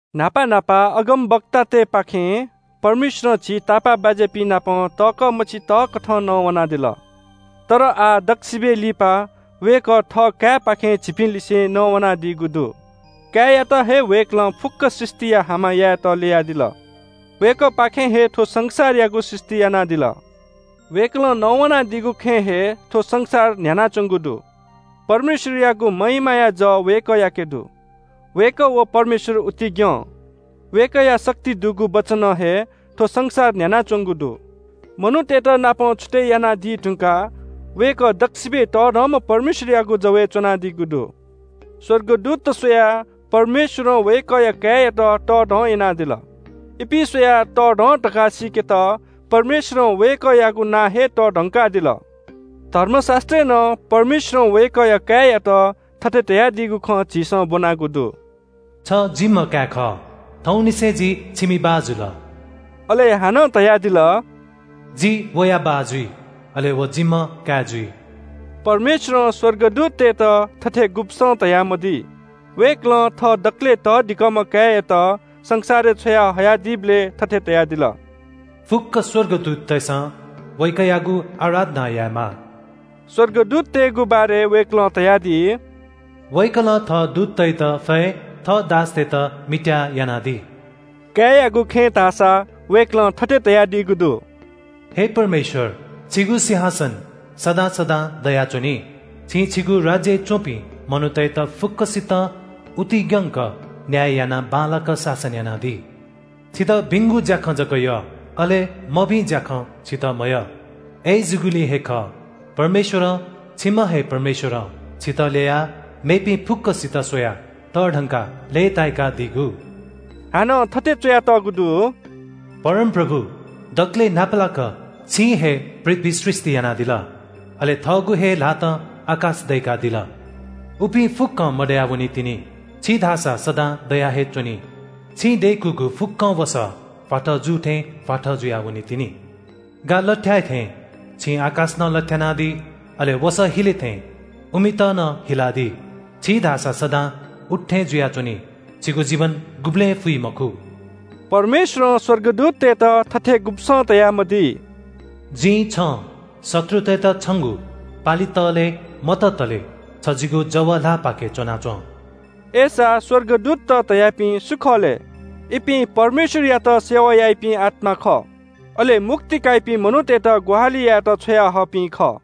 न्‍हापा न्‍हापा अगमवक्तातय्‌पाखें परमेश्‍वरं झी तापाःबाज्‍यापिं नाप तःकः मछि तःकथं नवानादिल। तर आः दक्‍वसिबय् लिपा वय्‌कः थः काय्‌पाखें झीपिंलिसें नवानादीगु दु। काय्‌यात हे वय्‌कलं फुक्‍क सृष्‍टिया हामा यायेत ल्‍ययादिल। वय्‌कःपाखें हे थ्‍व संसारयागु सृष्‍टि यानादिल। वय्‌कलं नवानादीगु खँय् हे थ्‍व संसार न्‍ह्यानाच्‍वंगु दु। परमेश्‍वरयागु महिमाया जः वय्‌कःयाके दु। वय्‌कः व परमेश्‍वर उतिग्‍यं। वय्‌कःया शक्ति दुगु वचनं हे थ्‍व संसार न्‍ह्यानाच्‍वंगु दु। मनूतय्‌त पापं छुतय् यानादी धुंकाः वय्‌कः दक्‍वसिबय् तःधंम्‍ह परमेश्‍वरयागु जवय् च्‍वनादीगु दु। स्‍वर्गदूतत स्‍वयाः परमेश्‍वरं वय्‌कःया काय्‌यात तःधं यानादिल। इपिं स्‍वयाः तःधं धकाः सीकेत परमेश्‍वरं वय्‌कःयागु नां हे तःधंकादिल। धर्मशास्‍त्रय् नं परमेश्‍वरं वय्‌कःया काय्‌यात थथे धयादीगु खँ झीसं ब्‍वनागु दु – “छ जिम्‍ह काय् खः, थौंनिसें जि छिमि बाः जुल।” अले हानं धयादिल – “जि वया बाः जुइ, अले व जिम्‍ह काय् जुइ।” परमेश्‍वरं स्‍वर्गदूततय्‌त थथे गुब्‍सं धयामदी। वय्‌कलं थः दकलय् तःधिकःम्‍ह काय्‌यात संसारय् छ्वया हयादीबलय् थथे धयादिल – “फुक्‍क स्‍वर्गदूततय्‌सं वय्‌कःयागु आराधना यायेमाः।” स्‍वर्गदूततय्‌गु बारे वय्‌कलं धयादी, “वय्‌कलं थः दूततय्‌त फय्, थः दासतय्‌त मित्‍याः यानादी।” काय्‌यागु खँय् धाःसा वय्‌कलं थथे धयादीगु दु – “हे परमेश्‍वर, छिगु सिंहासन सदां सदां दयाच्‍वनी। छिं छिगु राज्‍यय् च्‍वंपिं मनूतय्‌त फुक्‍कसितं उतिग्‍यंक न्‍याय यानाः बांलाक शासन यानादी। छितः भिंगु ज्‍याखँ जक यः, अले मभिं ज्‍याखँ छितः मयः। अय्‌जूगुलिं हे खः, परमेश्‍वरं, छिम्‍ह हे परमेश्‍वरं, छितः ल्‍ययाः मेपिं फुक्‍कसित स्‍वयाः तःधंकाः लय्‌ताय्‌कादीगु।” हानं थथे च्‍वयातःगु दु – “परमप्रभु, दकलय् न्‍हापालाक छिं हे पृथ्‍वी सृष्‍टि यानादिल, अले थःगु हे ल्‍हातं आकाश दय्‌कादिल। उपिं फुक्‍कं मदया वनीतिनि, छि धाःसा सदां दया हे च्‍वनी। छिं दय्‌कूगु फुक्‍कं वसः भ्‍वाथः जू थें भ्‍वाथः जुया वनीतिनि। गा लथ्‍याय् थें छिं आकाश नं लथ्‍यानादी, अले वसः हिले थें उमित नं हिलादी। छि धाःसा सदां उत्‍थें जुयाच्‍वनी, छिगु जीवन गुबलें फुइ मखु।” परमेश्‍वरं स्‍वर्गदूततय्‌त थथे गुब्‍सं धयामदी। “जिं छं शत्रुतय्‌त छंगु पालि तःले मततले छ जिगु जव ल्‍हाःपाखे च्‍वनाच्‍वँ।” अय्‌सा स्‍वर्गदूतत धयापिं सु खः लय्? इपिं परमेश्‍वरयात सेवा याइपिं आत्‍मात खः। अले मुक्ति काइपिं मनूतय्‌त ग्‍वाहालि यायेत छ्वयाहःपिं खः।